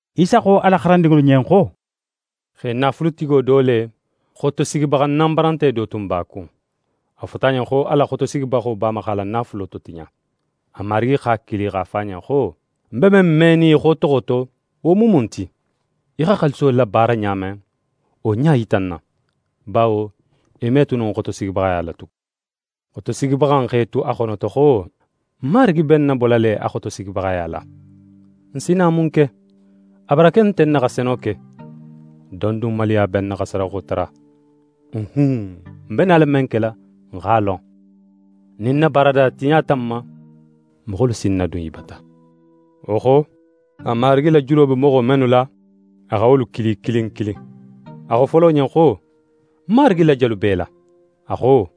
Isa xo a la xarandinŋolu ɲen xo: «Xe naafulutigo do le, xotosigibaxa nanbarante do tun b'a kun. A fota a ɲen xo a la xotosigibaxo b'a ma x'a la naafulo totiɲa. A marigi x'a kili, x'a fo a ɲen xo: “Ń be men menin í xotoxo to, wo mu mun ti? Í xa xaaliso labaara ɲa men, wo ɲa yita ń na, bawo í me tu no ń xotosigibaxaya la tugun.” Xotosigibaxa in x'é tu a xonoto xo: “Ń marigi be ń nabola le a xotosigibaxaya la. Ń si na mun ke? A barake nte ń na xa seno ke, don dun maluya be ń na xa sadaxo tara. Uhun! Ń be nala men kela, ń x'a lon. Nin ń na baarada tiɲata ń ma, moxolu si ń nadun i bata.” Wo xo, a marigi la julo be moxo mennu la, a xa wolu kili kilin kilin. A xo folo ɲen xo: “Ń marigi la jelu b'é la?” A xo: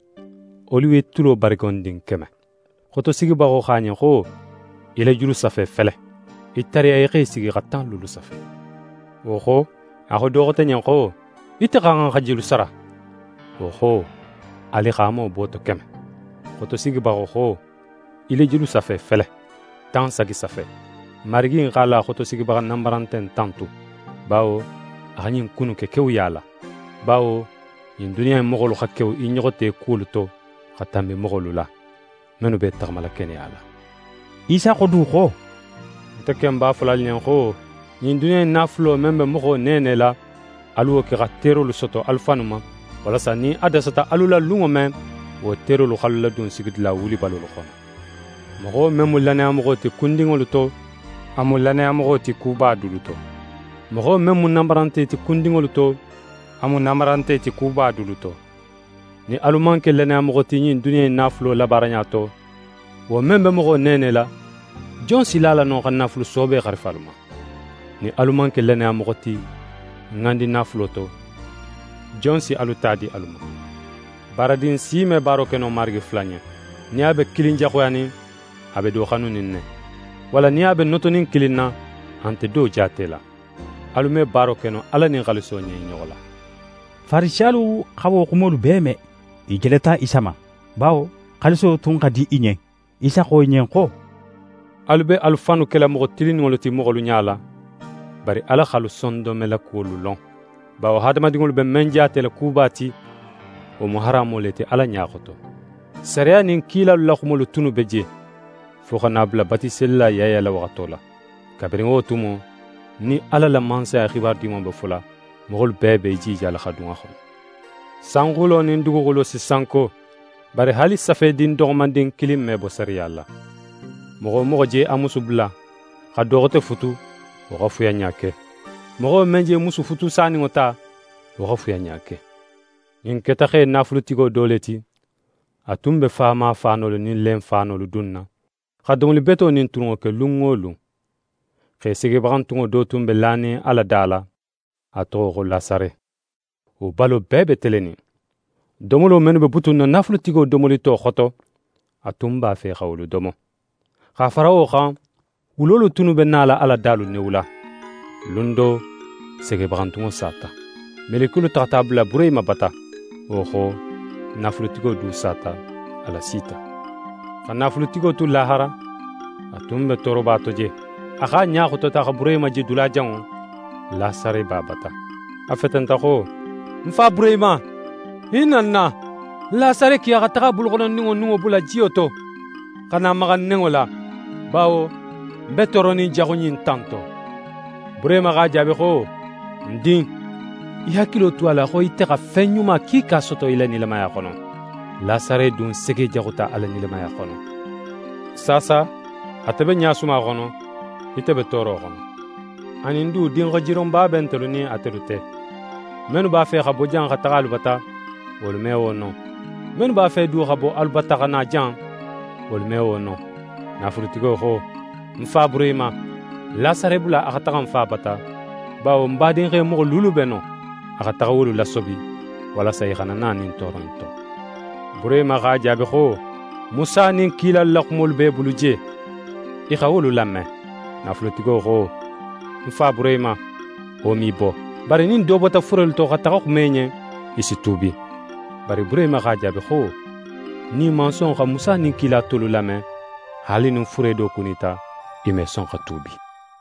“Oliwetulo barigondin keme.” Xotosigibaxo xo a ɲen xo: “Í la julusafe fele. Í tariya í x'é sigi xa tan luulu safe.” Wo xo, a xo do xote ɲen xo: “Ite xa xan xa jelu sara?” Wo xo: “Alixaamo booto keme.” Xotosigibaxo xo: “Í la julusafe fele. Tan sagi safe.” Marigi in x'a la xotosigibaxa nanbarante in tantu, bawo a xa ɲin ku innu ke kewuya la. Bawo ɲin duniya in moxolu xa kewu i ɲoxo te kuwolu to xa tanbi moxolu la, mennu be i taxamala keneya la.» Isa xo du xo: «Nte ken b'a fola alu ɲen xo ɲin duniya in naafulo, men be moxo neenela, alu wo ke xa terolu soto alu fannu ma, walasa nin a dasata alu la lunŋo men, wo terolu x'alu ladun sigidula wulibalolu xono. Moxo men mu lannayamoxo ti kundinŋolu to, a mu lannayamoxo ti kuba dulu to; moxo men mu nanbarante ti kundinŋolu to, a mu nanbarante ti kuba dulu to. Nin alu man ke lannayamoxo ti ɲin duniya in naafulo labaaraɲa to, wo men be moxo neenela, jon si la a la no xa naafulu soobe xarifa alu ma? Nin alu man ke lannayamoxo ti ŋandinaafulo to, jon si alu ta di alu ma? «Baaradin si me baaro ke no marigi fula ɲen. Nin a be kilin jaxuyanin, a be do xanunin ne. Walla nin a be notonin kilin na, a nte do jaatela. Alu me baaro ke no Ala nin xaaliso ɲen i ɲoxo la.» Farisiyalu xa wo xumolu bee me, i jeleta Isa ma, bawo xaaliso tun xa di i ɲen. Isa xo i ɲen xo: «Alu be alu fannu kela moxo tilinninŋolu ti moxolu ɲala, bari Ala x'alu sondonmelakuwolu lon; bawo hadamadinŋolu be men jaatela kuba ti, wo mu haramo le ti Ala ɲa xoto. «Sariya nin kilalu la xumolu tunnu be je, fo xa na a bula Batiselila Yaya la waxato la. Kabirin wo tumo, nin Ala la Mansaya xibaru Dimanŋo be fola, moxolu bee be i jijala xa dun a xono. Sanxulo nin duguxulo si sanko, bari haali safedin doxomandin kilin me bo sariya la. «Moxo wo moxo je a musu bula, xa do xote futu, wo xa fuyanɲa ke. Moxo men je musu futusaninŋo ta, wo xa fuyanɲa ke.» «Ɲin keta xe naafulutigo do le ti, a tun be faama faanolu nin lenfaanolu dunna, xa domoli beto nin tulunŋo ke lun wo lun. Xe segebaxantunŋo do tun be lanin a la da la, a toxo xo Lasare. Wo balo bee be telenin. Domolo mennu be butunna naafulutigo domolito xoto, a tun b'a fe xa wolu domo. X'a fara wo xan, wulolu tunnu be nala a la dalu newula. «Lun do, segebaxantunŋo sata. Melekiyolu taxata a bula Burehima bata. Wo xo, naafulutigo du sata, a lasita. Xa naafulutigo tu lahara, a tun be tooroba to je. A x'a ɲa xotota xa Burehima je dulajanŋo, Lasare b'a bata. A fetenta xo: “Ń Fa Burehima, hinna ń na; Lasare ki a xa taxa a buluxonondinŋo nunŋo bula jiyo to, xa na maxa ń nenŋo la, bawo ń be tooronin jaxu ɲin ta in to.” Burehima x'a jaabi xo: “Ń din, í hakilo tu a la xo ite xa fen ɲuma kiika soto í la nilamaya xono. Lasare dun segejaxuta a la nilamaya xono. Saasa ate be ɲasuma xono, ite be tooro xono. Anin du, dinxajironba be ntelu nin atelu te. Mennu b'a fe xa bo jan xa taxa alu bata, wolu me wo no; mennu b'a fe du xa bo alu bata xa na jan, wolu me wo no.” Naafulutigo xo: “Ń fa Burehima, Lasare bula a xa taxa ń fa bata, bawo ń badinxe moxo luulu be non. A xa taxa wolu lasobi, walasa i xana na ɲin tooro in to.” Burehima x'a jaabi xo: “Musa nin kilalu la xumolu b'e bulu je: I xa wolu lame.” Naafulutigo xo: “Ń fa Burehima, wo me i bo. Bari nin do bota furelu to xa taxa xuma i ɲen, i si tuubi.” Bari Burehima x'a jaabi xo: “Nin i man son xa Musa nin kila tolu lame, haali nin fure do kunita, i me son xa tuubi.”»